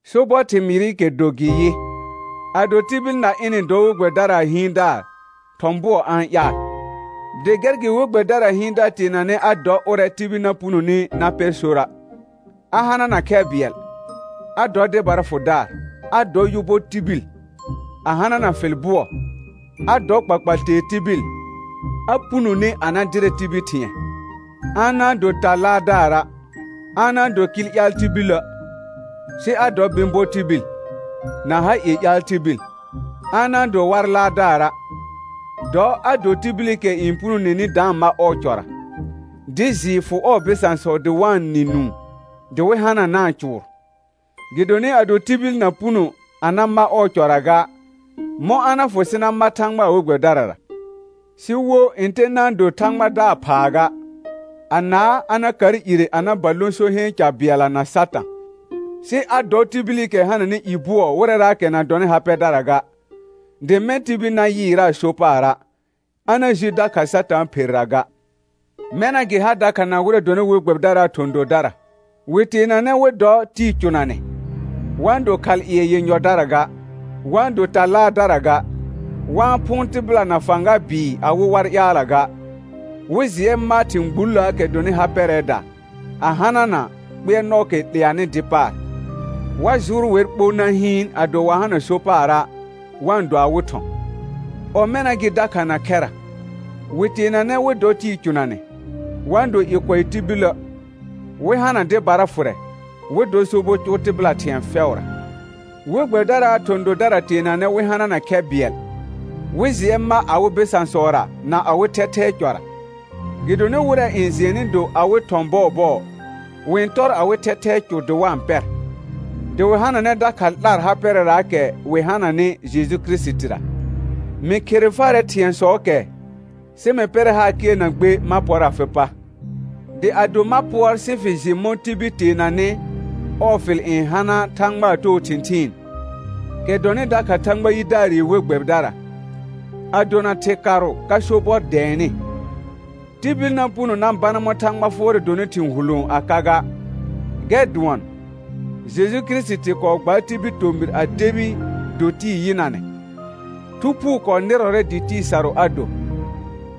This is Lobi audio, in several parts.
Sobɔr thɩmɩɩrɩkɛ do gɩ yɩ: Ado tibil na ɩnɩ-n dɔ we gbɛbɩdaraa hɩɩndaar thɔ̃ bʋɔ a-n ƴaal. Dɩ gɛr gɩ we gbɛbɩdaraa hɩɩndaar teenanɛ a dɔ ʋrɛ tibil na punoni na pɛr sora' a hanana khɛ bɩɛl, a dɔ dɩbara fʋdaar, a dɔ yʋ bɔ tibil, a hanana fɩl bʋɔ, a dɔ kpakpal tee tibil, a punone a na dɩrɛ tibil thɩ̃ɛ; a na-n do ta laardaara', a na-n do kɩl ƴaal tibilə', sɩ a dɔ bɩ̃ bɔ tibil, na ha ie ƴaal tibil, a na-n do war laardaara'. Dɔ a do tibilikɛ n punoneni da-n ma ɔɔ cɔra, dɩ jɩɩ fʋ ɔɔ bɩsãsɔ dɩ wa-n nɩ nũu dɩ wɩ hananaa cʋʋr. Gɩdonɩ ado tibil na puno a na ma ɔɔ cɔra ga, mɔ̃ a na fʋ sɩ na ma Thãgbaa we gbɛbɩdarara? Sɩ wo ntɛ na-n do Thãgbadaar phaa ga, anaa a na kar ire a na ba lõ so heen ca bɩɛlla na Satã. Sɩ a dɔ tibilikɛ hananɩ i bʋɔ wɩrɛraakɛ na dɔnɩ ha pɛdara ga, dɩ mɛ̃ tibil na yɩɩraa so paara', a na ji dakha Satãa pherra ga. Mɛna gɩ ha dakha na wɩrɛ dɔnɩ we gbɛbɩdaraa thɔ̃ dodara, wɩ teenanɛ wɩ dɔ tɩɩ cʋnanɛ, wa-n do khalƴɩɛ yenyɔdara ga, wa-n do ta laardara ga, wa-n phʋʋn tɩbɩla na fãga bɩɩ awɩ war ƴaalla ga, wɩ jɩɛ ma thɩ̃ gbulləəkɛ dɔnɩ ha pɛrɛɛda, a hanana kpɩɛrnɔɔkɛ 'leanɩ dɩ paar. Wa jʋʋr wɛr ɓo na hɩɩn ado wa hana so paara' wa-n do awɩ thɔ̃. Ɔmɛna gɩ dakha na khɛra, wɩ teenanɛ wɩ dɔ tɩɩ cʋnanɛ, wa-n do i kʋɛ tibilə', wɩ hana dɩbara fʋrɛ, wɩ dɔ sobɔ cʋʋ tɩbɩla thɩ̃ɛ fɛʋra. We gbɛbɩdaraa thɔ̃ dodara teenanɛ wɩ hanana khɛ bɩɛl, wɩ jɩɛ ma awɩ bɩsãsɔra na awɩ thɛthɛɛ cɔra. Gɩdonɩ wɩrɛ n jɩɛnnɩ do awɩ thɔ̃ bɔɔbɔɔ, wɩ-n tɔr awɩ thɛthɛɛ cʋ dɩ wa-n pɛr, dɩ wɩ hananɛ dakha 'lar ha pɛrɛraakɛ wɩ hananɩ Jeju Kirisitira. Mɩ khere farɛ thɩ̃ɛsɔɔkɛ sɩ mɩ pɛrɛ haar kɩɛr na gbe ma pɔr afɩ pa. Dɩ ado ma pʋɔr sɩ fɩ jɩ mɔ̃ tibil teenanɩ ɔɔ fɩl n hana Thãgbaa too thɩ̃thɩɩn, kɛ dɔnɩ dakha Thãgba yidaarɩ we gbɛbɩdara, a dona thɩkarʋ ka sobɔr dɛɛnɩ. Tibil na puno na bana mɔ̃ Thãgba fʋɔrɛ donɩ thɩ̃ hulõo a ka ga, gɛr dʋɔn: Jeju Kirisiti kɔɔ gbaar tibil tomɩr a debi do tɩɩ yɩnanɛ, Thu Phuu kɔɔ nɩrɔrɛ dɩ tɩɩ sarʋ a do;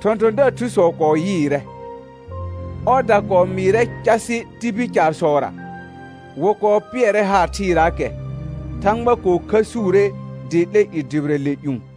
thɔ̃thɔ̃daar thusɔ kɔɔ yɩɩrɛ. Ɔɔda kɔɔ mɩɩrɛ casɩ tibil caarsɔra; wɩ kɔɔ pɩɛrɛ haar thɩɩraakɛ, Thãgba kɔɔ khəsuure dɩ 'lɛ i dʋbɩrɛ le ƴũ.